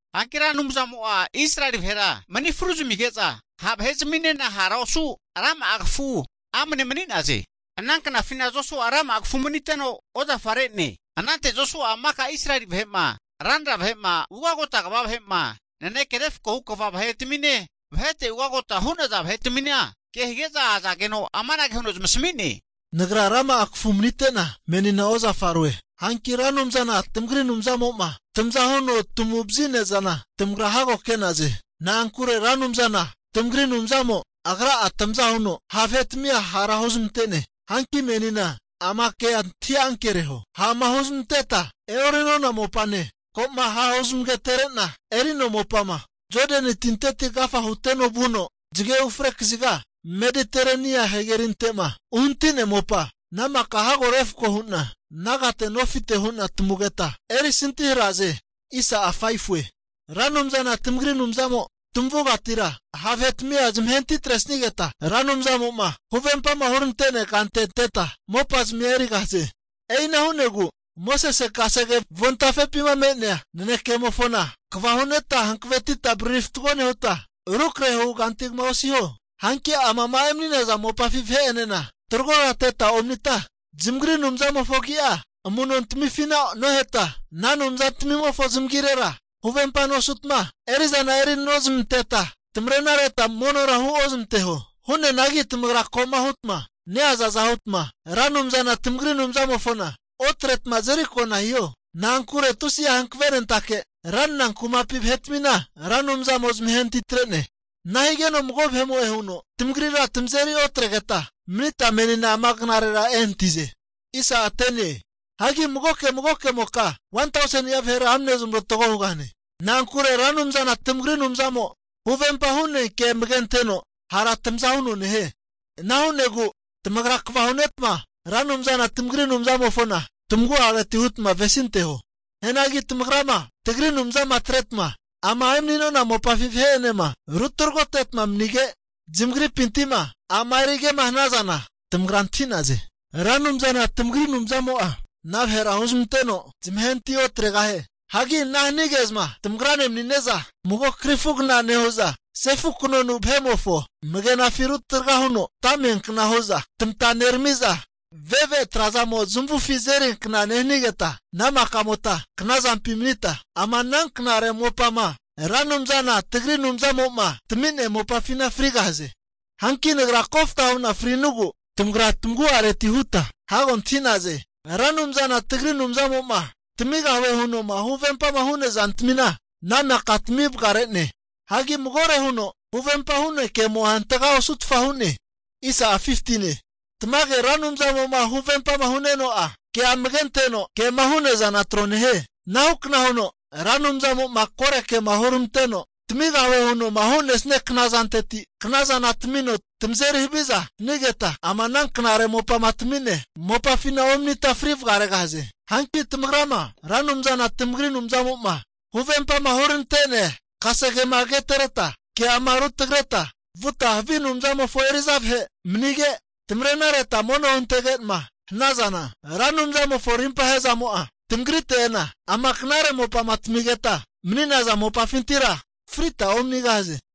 Hanki Ra Anumzamo'a Israeli vahera mani fru zamige'za ha' vahe'zaminena hara osu rama'a kafu amane mani'naze. Ana knafina Josua'a rama'a kafu maniteno ozafare'ne. Anante Josua'a maka Israeli vahe'ma, ranra vahe'ma, ugagota kva vahe'ma, naneke refko hu kva vahetamine, vahete ugagota hu'naza vahe'tamina ke hige'za azageno amanage huno zamasami'ne, Nagra rama'a kafu manite'na menina ozafaroe. Hanki Ra Anumzana tamagri Anumzamo'ma tamaza huno tamagu vazi'nea zana tamagra'a hago ke'naze. Na'ankure Ra Anumzana tamagri Anumzamo Agra'a tamaza huno ha' vahetamia hara huzmante'ne. Hanki menina ama kea antahi ankereho, ha'ma huzamanteta e'ori'nona mopane, ko'ma hahu zamagatereta eri'nona mopama, Jodani tinteti agafa huteno vuno zage ufre kaziga Mediterenia hagerinte'ma uhanati'nea mopa, ana maka hago refko hu'na nagate nofite hu'na tamugeta erisantihare'naze. Ra Anumzana tamagri Anumzamo tamavugatira ha' vahe'tamia zamahe'natitresigeta, Ra Anumzamo'ma huvempama huramante'nea kante anteta mopazamia erigahaze. E'ina hu'negu Mosese'ma kasege avontafepima krente'nea nanekemofona kva hu'neta hankavetita, avariri fatgo nehuta, rukrahe hu kanti kama osiho. Hanki amama emani'naza mopafi vahe'enena taragoteta omanita, zamagri anumzamofo agi'a amu'nontamifina oheta, ana anumzantamimofo zamagirera huvempa osutma, eri'zana erinozmanteta, tamarenareta monora huozamanteho. Hu'neanagi tamagra ko'ma hutma neazaza hutma, Ra Anumzana tamagri Anumzamofona otretma azeriko'na hiho. Na'ankure tusi'a hankavenentake ranra kumapi vahe'tamina Ra Anumzamo zamahenatitre'ne. Ana higeno mago vahe'mo'e huno tamagrira tamazeri otrageta manita menina ama knarera ehanati'naze. Hagi magoke magokemoka 1tauseni'a vahera amne zamorotgo hugahane. Na'ankure Ra Anumzana tamagri Anumzamo'a huvempa hu'nea kea amage anteno hara tamaza huno nehie. Ana hu'negu tamagra kva hunetma Ra Anumzana tagri Anumzamofona tamagu'areti hutma avesinteho. Hianagi tamagrama tagri Anumzama atretma, ama emani'nona mopafi vahe'enema ru tragoteta manige, zamagripinti'ma a'ma erige'ma hanazana, tamagra antahi'naze, Ra Anumzana tamagri Anumzamo'a tamaza huno hara ana vahera huzmanteno, zamahenati otregahie. Hagi ana hanige'zma tamagrane mani'ne'za mago krifugna nehu'za, sefu kanonu vahe'mofo amagenafi rutraga huno ata amiankna hu'za tamata nerami'za, ave've tra'zamo zamavufi azeriankna nehanigeta, ana maka'mota knazampi mani'neta ama ana knare mopama Ra Anumzana tagri Anumzamo'ma tami'nea mopafina frigahaze. Hanki nagra kofta huna fri'nugu, tamagra tamagu'areti huta hago antahi'naze, Ra Anumzana tagri Anumzamo'ma tamigahue huno huvempama hu'nea zantamina ana maka tamivagare'ne. Hagi magore huno huvempa hu'nea kemo'a hantaga osutfa hu'ne. Tamage, Ra Anumzamo'ma huvempama hu'nenuno'a, kea amage anteno kema hu'nea zana tro nehie. Anahukna huno Ra Anumzamo'ma kore kema huramanteno tamigahue huno'ma hu'nesia knazanteti, knazana tamino tamazeri haviza hanigeta, ama knare mopama tami'nea mopafina omanita fri vagaregahaze. Hanki tamagrama Ra Anumzana tamagri Anumzamo'ma huvempama huramante'nea kasegema agatenereta ke'ama rutagreta vuta havi anumzamofo eri'za vahe manige, tamarenareta mono huntege'ma hanazana, Ra Anumzamofo rimpahe'zamo'a tamagrite ena, ama knare mopama tamigeta mani'naza mopafintira frita omanigahaze.